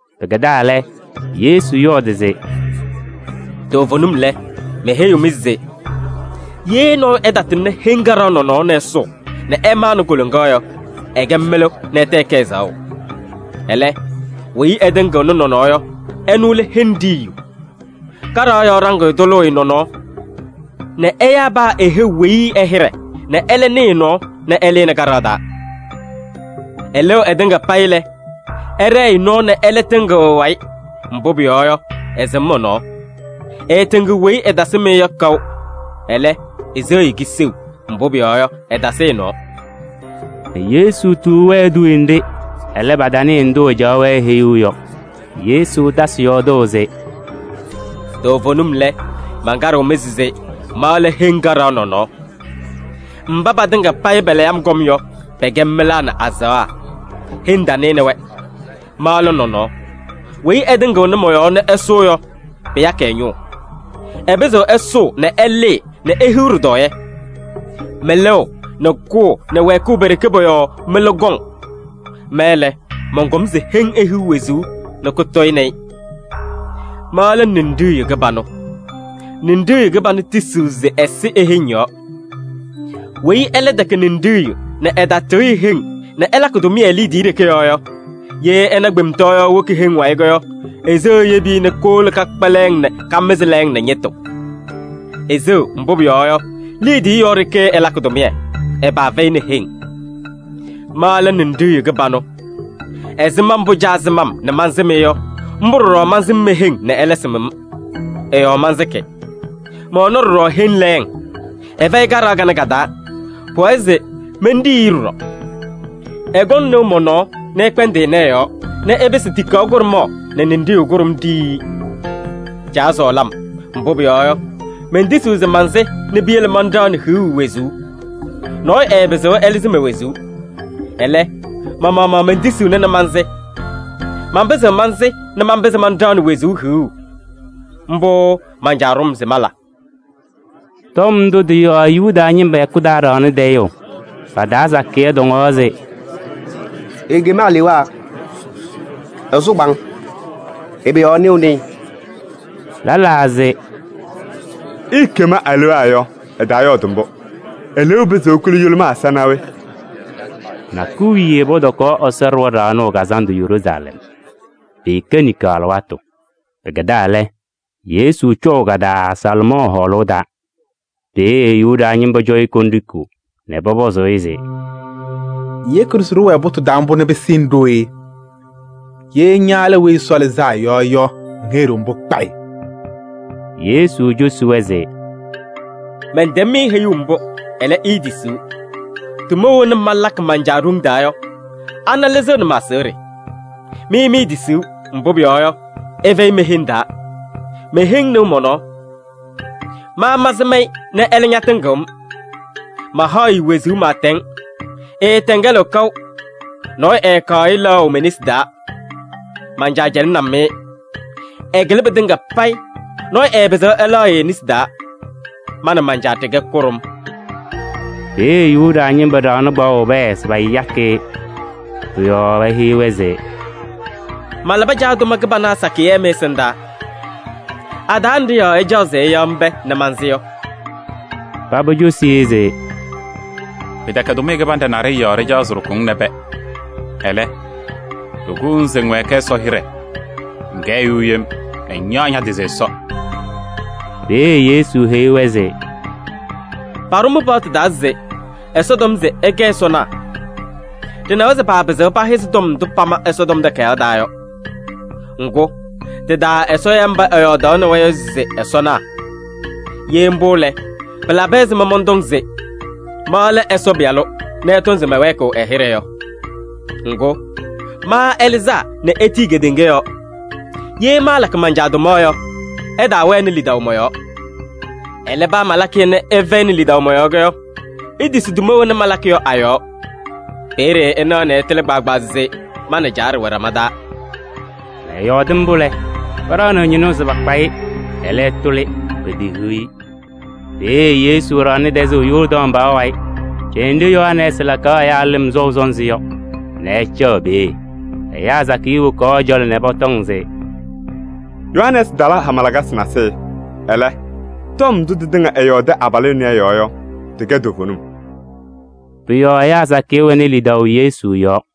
Pɩkɛdaa lɛ, Yesu yɔɔdɩ se: “Toovenim lɛ, meheyiɣ-mɩ se: ye nɔɔyʋ ɛtatɩŋnɩ heŋ kaɖaɣ nɔnɔɔ nɛ ɛsʋʋ nɛ ɛmanɩ koloŋa yɔ, ɛkɛ mɩlʋ nɛ ɛtɛ ɛkɛ ɛzaɣʋ. Ɛlɛ, weyi ɛtɩŋɩɣnɩ nɔnɔɔ yɔ, ɛnʋ lɛ heŋ ɖiyiyu. Kaɖaɣ yɔɔ ɖaŋɩyʋ tʋlʋʋ-ɩ nɔnɔɔ nɛ ɛyaa paa e-heu weyi ɛ-hɩɖɛ nɛ ɛlɛ nɩɩ ɛ-nɔɔ nɛ ɛlɩnɩ kaɖaɣ taa. Ɩlɩɣ ɩtɩŋa payɩ lɛ, ɛɖɛɛ-ɩ nɔɔ nɛ ɛlɛ tɩŋɩɣ ɛ-wayɩ, mbʋ pʋyɔɔ yɔ, ɩsɩm ɛ-nɔɔ. Ɩɩtɩŋɩɣ weyi ɩtasɩm-ɩ yɔ kaʋ, ɛlɛ, iseɣ-i kiseu, mbʋ pʋyɔɔ yɔ, ɩtasɩ ɛ-nɔɔ.” Yesu tuu-wɛ eduuye nɖɩ, ɛlɛ, patanɩɩ ndʋ ɛcaɣaɣ-wɛ heyuu yɔ. Yesu tasɩ yɔɔdʋʋ se: “Toovenim lɛ, mankaɖɩɣ-mɩ se ma lɛ heŋ kaɖaɣ nɔnɔɔ. Mba patɩŋa payɩ palayɩ-m kɔm yɔ, pɛkɛ mɩlaa nɛ azaɣa. Heŋ tanɩnɩ-wɛ. Ma lɛ nɔnɔɔ. Weyi ɛtɩŋɩɣnɩ mɔ-yɔɔ nɛ ɛsʋʋ yɔ, pɩyakɩ ɛ-ñʋʋ. Ɛpɩzɩɣ ɛsʋʋ nɛ ɛlɩɩ nɛ ehiɣ ɖɩtɔɔyɛ. Mɩlʋʋ nɛ kʋʋ nɛ wɛɛkʋʋ pe-ɖeke pɔ-yɔɔ mɩlʋ kɔŋ. Ma lɛ, mɔnkɔm se heŋ ihiɣ wezuu nɛ kʋtɔyɩnɩ-ɩ. Ma lɛ ninɖiɣyu kɩbanʋ. Ninɖiɣyu kɩbanʋ tisiɣ nɛ ɛsɩ e-heŋ yɔɔ. Weyi ɛlɛ tɛkɛ ninɖiɣyu nɛ ɛtatɩɣyɩ heŋ nɛ ɛlakɩ tʋmɩyɛ liidiye ɖeke yɔɔ yɔ, ye ɛna kpemtɔɔyaɣ woki heŋ wayɩ yɔ, eseɣ eyebi-i nɛ kowolo kakpa lɛɛŋ nɛ kamɩzɩ lɛɛŋ nɛ ñɩtʋ. Eseɣ, mbʋ pʋyɔɔ yɔ, liidiye yɔɔ ɖeke ɛlakɩ tʋmɩyɛ, ɛ-paa fɛyɩnɩ heŋ. Ma lɛ Ninɖiɣyu kɩbanʋ. Ɛzɩma mbʋ Caa sɩm-m nɛ mansɩm-ɩ yɔ, mbʋ ɖɔɖɔ mansɩm me-heŋ nɛ ɛlɛ sɩm-m. Ɩ-yɔɔ mansɩkɩ. Mɛwɛnɩ ɖɔɖɔ heŋ lɛɛŋ, ɩfɛyɩ kaɖaɣ kanɛ ka-taa. Pʋwɛɛ se menɖiyi-i ɖɔɖɔ. Ɩkɔŋ nɩʋ mɔ-nɔɔ nɛ ɩkpɛndɩ ɩnɛ ɩ-yɔɔ nɛ ɩpɩsɩ tikaɣ kʋɖʋmaɣ nɛ ninɖiɣyu kʋɖʋm ɖiyi-i. Caa sɔɔlɩ-m, mbʋ pʋyɔɔ yɔ, mentisiɣ se mansɩ nɛ piyele manɖaɣnɩ hiɣu wezuu. Nɔɔyʋ ɛɛpɩzɩɣ ɛlɩzɩ me-wezuu. Ɛlɛ, ma-maɣmaɣ mentisiɣna nɛ mansɩ. Manpɩzɩɣ mansɩ nɛ manpɩzɩ manɖaɣnɩ wezuu hiɣu. Mbʋ man-Caa ɖʋ-m se mala.” Tɔm ndʋ tɩ-yɔɔ Yuda ñɩma hɛkʋ taa ɖaɣnɩ tayʋʋ. Pa-taa sakɩyɛ tɔŋaɣ se: “Ekem alewaa! Ɛsʋ kpaaŋ! Ɛbɛ yɔɔ ɩnɩɣnɩ-ɩ?” Lɛlaa se: “Eekem alewaa yɔ, ɛtaayɔɔdɩ mbʋ. Eleeu pɩzɩɣ ekuli yʋlʋmaa ɛza naa we?” Nakʋyʋ wiye pɔtɔkaɣ Ɛsɔ Ɖɩɣa Ɖaɣnʋʋ Kazandʋ Yeruusalɛm. Pɩɩkɛ niŋkaɣ alɩwaatʋ. Pɩkɛdaa lɛ, Yesu cɔʋ ka-taa Salomɔɔ Hɔɔlʋʋ taa. Peeye Yuda ñɩma cɔ-ɩ kondiko nɛ pɔpɔzɩ-ɩ se: “Ŋyeki-ɖʋ se ɖɩwɛɛ pʋtʋʋ taa mbʋ nɛ pɩsɩnɩ ɖooye? Ye ña lɛ Weyi Ɛsɔ Lɩzaa Yɔ yɔ, ŋheyi-ɖʋ mbʋ kpayɩ.” Yesu cosi-wɛ se: “Mɛntɛm-mɩ heyuu mbʋ, ɛlɛ, iitisiɣ. Tʋma wena malakɩ man-Caa ɖoŋ taa yɔ, ana lɩzɩɣnɩ ma-aseɣɖe. Mɩ miitisiɣ, mbʋ pʋyɔɔ yɔ, ɩfɛyɩ me-heŋ taa. Me-heŋ nɩɣ mɔ-nɔɔ. Ma mansɩm-ɩ nɛ ɛlɛ ñatɩŋɩɣ-m. Mahaɣ-ɩ wezuu pɩɩtɛŋ, ɩɩtɛŋɛlɩɣ kaʋ. Nɔɔyʋ ɛɛkaɣ-ɩ lɛɣʋ me-nesi taa. Man-Caa cɛlɩnɩ-m-ɩ, ɛkɩlɩ pɩtɩŋa payɩ, nɔɔyʋ ɛɛpɩzɩɣ ɛlɛɣ-ɩ e-nesi taa. Ma nɛ man-Caa ɖɩkɛ kʋɖʋm.” Peeye Yuda ñɩma ɖaɣnɩ kpaɣʋ pɛɛ se payakɩ-ɩ. Pʋ-yɔɔ eheyi-wɛ se: “Malabɩ Caa tʋma kɩbana sakɩyɛ mɩ-ɛsɩndaa. A-taa nɖɩ yɔɔ ɩcaɣ se ɩyaɣ-m pɛɛ nɛ mansɩ yɔ?” Paba cosi-i se: “Pɩtɛkɛ tʋmɩyɛ kɩbanɖɛ naɖɩyɛ yɔɔ ɖɩcaɣ se ɖɩkʋ-ŋ nɛ pɛɛ. Ɛlɛ, ɖɩkʋʋ-ŋ se ŋwɛɛkɩ Ɛsɔ hɩɖɛ: ŋkɛ ɛyʋ yem nɛ ŋyaɣ ña-tɩ se Ɛsɔ.” Peeye Yesu heyi-wɛ se: “Paɖʋ mɩ-paɣtʋ taa se: ‘Ɛsɔ tɔm se ɩkɛ ɛsɔnaa.’ Ɖɩnawa se paapɩzɩɣ pahɩzɩ tɔm ndʋ pama Ɛsɔtɔm Takayaɣ taa yɔ. Ŋgʋ, tɩ-taa Ɛsɔ ya mba ɛyɔɔdaɣnɩ-wɛ yɔ se ɛsɔnaa. Ye mbʋ lɛ, pɩlabɩ ɛzɩma mɔntɔ se: ma lɛ Ɛsɔ Pɩyalʋ nɛ ɩtɔŋ se mɛwɛɛkɩɣ ɛ-hɩɖɛ yɔ? Ŋgʋ, ma ɛlɩzaa nɛ etiyi kedeŋa yɔɔ. Ye maalakɩ man-Caa tʋma yɔ, ɩtaawɛnɩ lidaʋ mɔ-yɔɔ. Ɛlɛ, paa malakɩ-yɛ nɛ ɩfɛyɩnɩ lidaʋ mɔ-yɔɔ yɔ, itisi tʋma wena malakɩ yɔ a-yɔɔ. Peeye ɩnaɣ nɛ ɩtɩlɩ kpaagbaa se ma nɛ Caa ɖɩwɛ ɖama taa.” Ɛyɔɔdɩ mbʋ lɛ, paɖaɣnɩɣ ñɩnʋʋ se pakpa-ɩ, ɛlɛ, ɛtʋlɩ, petehiɣ-i. Peeye Yesu ɖaɣnɩ tɛzʋʋ Yɔɔrdaŋ pɔɔ wayɩ ɖenɖe Yohanɛɛsɩ kalabɩ ɛyaa lɩm sɔʋ sɔnzɩ yɔ nɛ ɛcaɣ peeye. Ɛyaa sakɩyɛ wokaɣ ɛ-cɔlɔ nɛ pɔtɔŋ se: “Yohanɛɛsɩ tala hama lakasɩ nasɩyɩ. Ɛlɛ, tɔm ndʋ tɩtɩŋa ɛyɔɔdɩ abalʋ ɛnɛ ɛ-yɔɔ yɔ, tɩkɛ toovenim.” Pʋ-yɔɔ ɛyaa sakɩyɛ wɛnɩ lidaʋ Yesu yɔɔ.